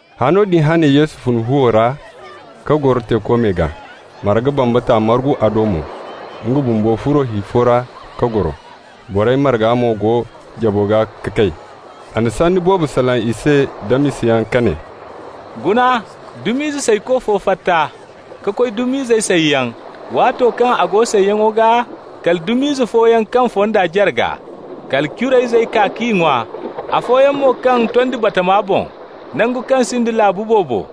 Hano din hane Yesu fun fuwo ra ka goro teeko me gaa. Marga bambata margu a do mo. Nga bumbo furo hi fo ra ka goro. Borey marga mo go jabo gaa ga kay. A na sanni boobo salaŋ i se da misayaŋ ka ne: «Guna, dum'izey sayko fo fatta ka koy dum'izey sayyaŋ. Waato kaŋ a go sayyaŋo gaa, kala dum'ize fooyaŋ kaŋ fonda jarga. Kala curayzey kaa k'i ŋwa. Afooyaŋ mo kaŋ tondi batama boŋ, nangu kaŋ sinda laabu boobo.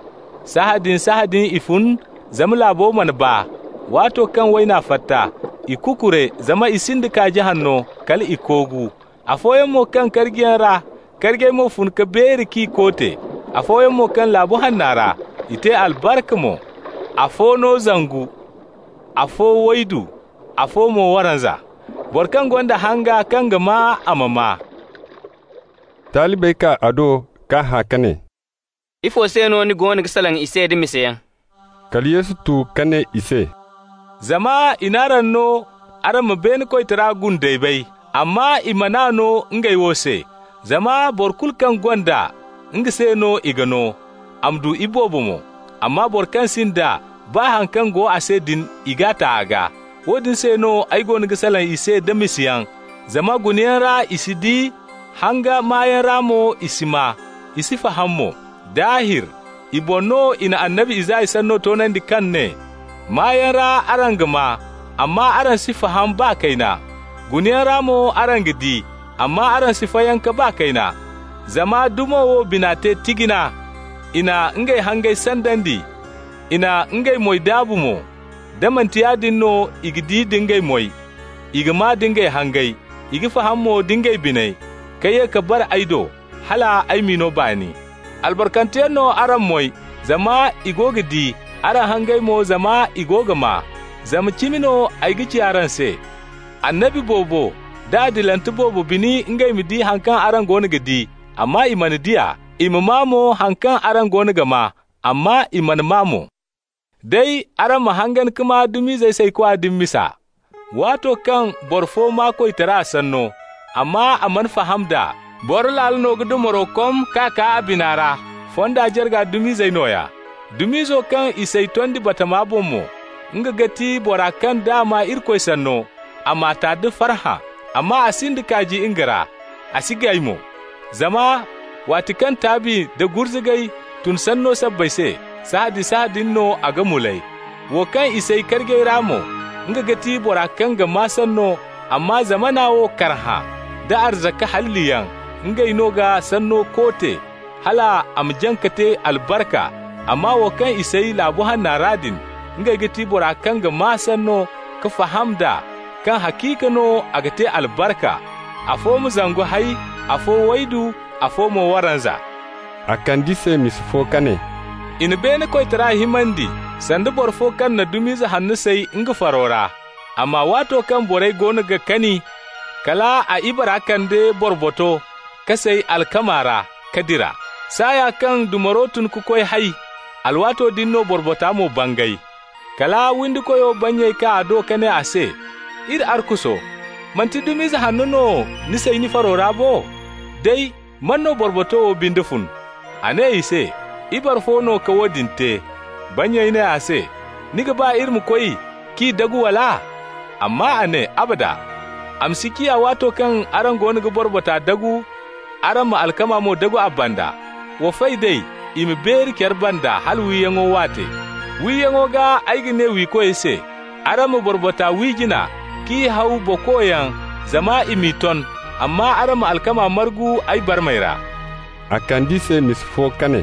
Sahãadin-sahãadin i fun, zama laabo mana baa. Waato kaŋ wayna fatta, i kukure zama i sinda kaaji hanno, hal i koogu. Afooyaŋ mo kaŋ karjiyaŋ ra, karjey mo fun ka beeri k'i koote. Afooyaŋ mo kaŋ laabu hanno ra. I te albarka mo, afo no zangu, afo waydu, afo mo waranza. Boro kaŋ gonda hanga kaŋ ga maa, a ma maa.» Talibey kaa a do k'a hã ka ne: «Ifo se no ni goono ga salaŋ i se da misayaŋ?» Kala Yesu tu ka ne i se: «Zama i n'araŋ no araŋ ma beene koytara gundey bay, amma i man'a no ngey wo se. Zama boro kulu kaŋ gonda, nga se no i ga no, a ma du iboobo mo. Amma boro kaŋ sinda, baa haŋ kaŋ go a se din, i g'a ta a gaa. Woodin se no ay goono ga salaŋ i se da misayaŋ, zama gunayaŋ ra i si di, hanga maayaŋ ra mo i si maa, i si faham mo. Daahir, i boŋ no i na annabi Isaya sanno toonandi kaŋ ne: ‹Maayaŋ ra araŋ ga maa, amma araŋ si faham baa kayna. Gunayaŋ ra mo araŋ ga di, amma araŋ si fayanka baa kayna. Zama dumo wo bina te tijina, i na ngey hangey sandandi, i na ngey moy daabu mo. Da manti yaadin no i ga di da ngey moy, i ga maa da ngey hangey, i ga faham mo da ngey biney, ka ye ka bare ay do hal ay m'i no baani.› Albarkanteyaŋ no araŋ moy, zama i go ga di, araŋ hangey mo, zama i go ga maa. Zama cimi no ay ga ci araŋ se, annabi boobo da adilante boobo bini ngey ma di haŋ kaŋ araŋ goono ga di, amma i mana di a, i ma maa mo haŋ kaŋ araŋ goono ga maa, amma i mana maa mo. Day, araŋ ma hangan ka maa dum'izey saykwa din misa. Waato kaŋ boro fo maa koytara sanno, amma a mana faham d'a, Boro Laalo no ga dumaro kom k'a kaa a bina ra. Fonda jarga dum'izey nooya. Dum'izo kaŋ i say tondi batama boŋ mo, nga ga ti bora kaŋ d'a maa Irikoy sanno, a m'a ta da farhã. Amma a sinda kaaji nga ra, a si gay mo. Zama waati kaŋ taabi nda gurzugay tun sanno sabbay se, sahãadin-sahãadin no a ga mulay. Wo kaŋ i say karjey ra mo, nga ga ti bora kaŋ ga maa sanno, amma zamana wo karhã, da arzaka halliyaŋ, ngey no ga sanno koote, hal a ma jaŋ ka te albarka. Amma wo kaŋ i say laabu hanno ra din, nga ga ti bora kaŋ ga maa sanno, ka faham d'a, kaŋ haciika no a ga te albarka. Afo ma zangu hay, afo waydu, afo mo waranza.» A kand'i se misa fo ka ne: «I na beene koytara himandi sanda boro fo kaŋ na dum'ize hanno say nga faro ra. Amma waato kaŋ borey goono ga kani, kal a ibara kande borboto ka say alkama ra, ka dira. Saaya kaŋ dumaro tun ka koy hay, alwaato din no borbota mo bangay. Kala windikoyo bannyey kaa a do ka ne a se: ‹Iri arkuso, manti dum'ize hanno no ni say ni faro ra bo? Day, man no borboto wo binde fun?› A ne i se: ‹Ibare fo no ka woodin te.› Bannyey ne a se: ‹Ni ga ba iri ma koy k'i dagu, wala?› Amma a ne: ‹Abada! A ma si ciya, waato kaŋ araŋ goono ga borbota dagu, araŋ ma alkama mo dagu a banda. Wa fay d'ey i ma beeri care banda hala wiyaŋo waate. Wiyaŋo gaa ay ga ne wiikoy se: Araŋ ma borbota wi jina, k'i haw bokoyaŋ zama i m'i ton, amma araŋ ma alkama margu ay barmey ra.›» A kand'i se misa fo ka ne: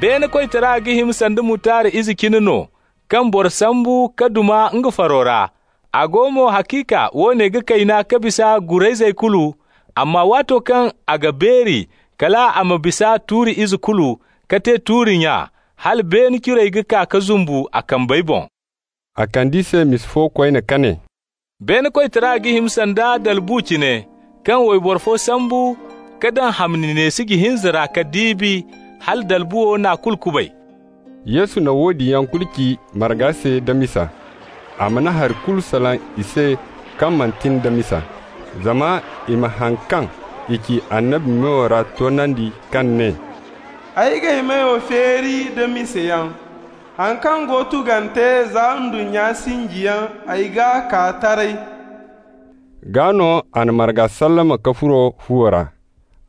«Beene koytara ga hima sanda mutard ize cine no, kaŋ boro sambu ka duma nga faro ra. A go mo, haciika woone ga kayna ka bisa gurayzey kulu, amma waato kaŋ a ga beeri, kal a ma bisa tuuri ize kulu, ka te tuuri-nya, hala beene curey ga kaa ka zumbu a kambey boŋ.» A kand'i se misa fo koyne ka ne: «Beene koytara ga hima sanda dalbu cine, kaŋ wayboro fo sambu ka daŋ hamni neesiji hinza ra ka diibi, hala dalbuwo n'a kulu kubay.» Yesu na woodin yaŋ kulu ci marga se da misa. A mana hari kulu salaŋ i se kaŋ manti nda misa, zama i ma haŋ kaŋ i ci annabi meyo ra toonandi, kaŋ ne: «Ay g'ay meyo feeri da misayaŋ. Haŋ kaŋ go tugante za ndunnya sinjiyaŋ, ay g'a kaa taray.» Gaa no a na marga sallama ka furo fuwo ra.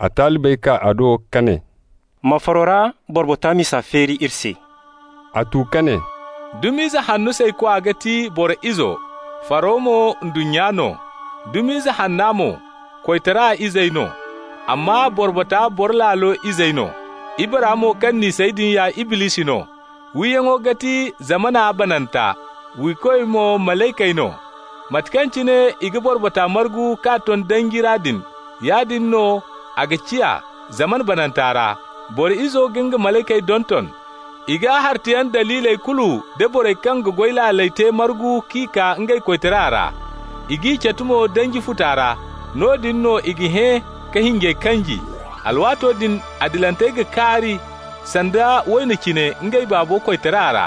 A talibey kaa a do ka ne: «Ma faro ra borbota misa feeri iri se.» A tu ka ne: «Dum'ize hanno saykwa ga ti Boro Izo, faro mo ndunnya no. Dum'ize hanna mo, koytara izey no, amma borbota Boro Laalo izey no. Ibara mo kaŋ n'i say din ya Iblisi no, wiyaŋo ga ti zamana bananta, wiikoy mo malaykey no. Mate kaŋ cine i ga borbota margu k'a ton danji ra din, yaadin no a ga ciya zamana bananta ra. Boro Izo ga nga malaykey donton. I ga hartayaŋ daliiley kulu nda borey kaŋ ga goy laaley te margu k'i kaa nga koytara ra. I g'i catu mo danji futa ra. Noodin no i ga hẽ ka hinjey kanji. Alwaato din adilantey ga kaari sanda wayno cine ngey Baabo koytara ra.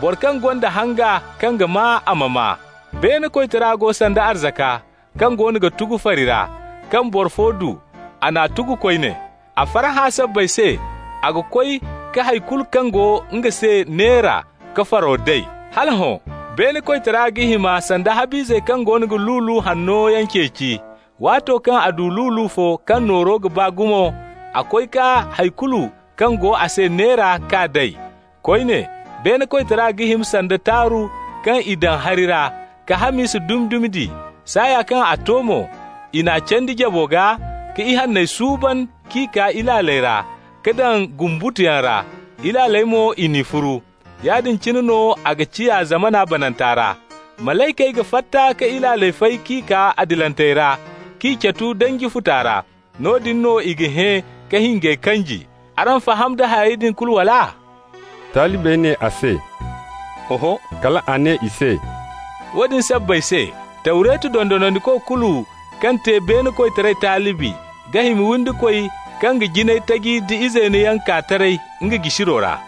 Boro kaŋ gonda hanga kaŋ ga maa, a ma maa. Beene koytara go sanda arzaka kaŋ goono ga tugu fari ra, kaŋ boro fo du, a n'a tugu koyne. A farhã sabbay se a ga koy ka hay kulu kaŋ go nga se neera, ka faro day. Hala hõ, beene koytara ga hima sanda hab'ize kaŋ goono ga lulu hanno yaŋ ceeci. Waato kaŋ a du lulu fo kaŋ nooro ga baa gumo, a koy ka hay kulu kaŋ go a se neera k'a day. Koyne, beene koytara ga hima sanda taaru kaŋ i daŋ hari ra, ka hamisa dumi-dumi di. Saaya kaŋ a to mo, i n'a candi jabo gaa, ka ihanney suuban k'i kaa ilaaley ra, ka daŋ gumbutuyaŋ ra. Ilaaley mo i n'i furu. Yaadin cine no a ga ciya zamana bananta ra. Malaykey ga fatta ka ilaaley fay k'i kaa adilantey ra, k'i catu danji futa ra. Noodin no i ga hẽ ka hinjey kanji. Araŋ faham da harey din kulu, wala?» Talibey ne a se: «Oho.» Kal a ne i se: «Woodin sabbay se: Tawretu dondonandiko kulu kaŋ te beene koytara talibi ga hima windikoy kaŋ ga jinay taji da izeeno yaŋ kaa taray nga jisiro ra.»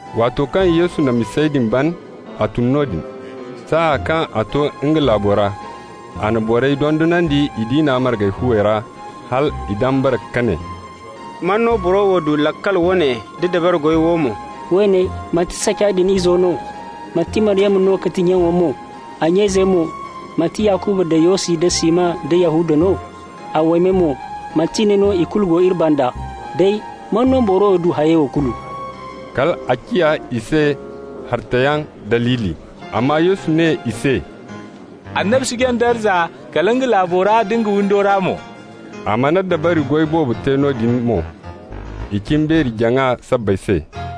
Waato kaŋ Yesu na misey din ban, a tun noodin. Saaya kaŋ a to nga laabo ra, a na borey dondonandi i diina marga fuwey ra, hal i dambara ka ne: «Man no boro wo du laakal woone da dabari goy wo mo? Woone, manti saca din izo no? Manti Maryama no ga ti nyaŋo mo? A nya izey mo, manti Yakuba da Yosi da Siman da Yahuda no? A waymey mo, manti ne no ikulu go iri banda? Day, man no boro wo du hayey wo kulu?» Kal a ciya i se hartayaŋ daliili. Amma Yesu ne i se: «Annabi si jaŋ darza kala nga laabo ra da nga windo ra mo.» A mana dabari goy boobo te noodin mo, i cimbeeri-jaŋa sabbay se.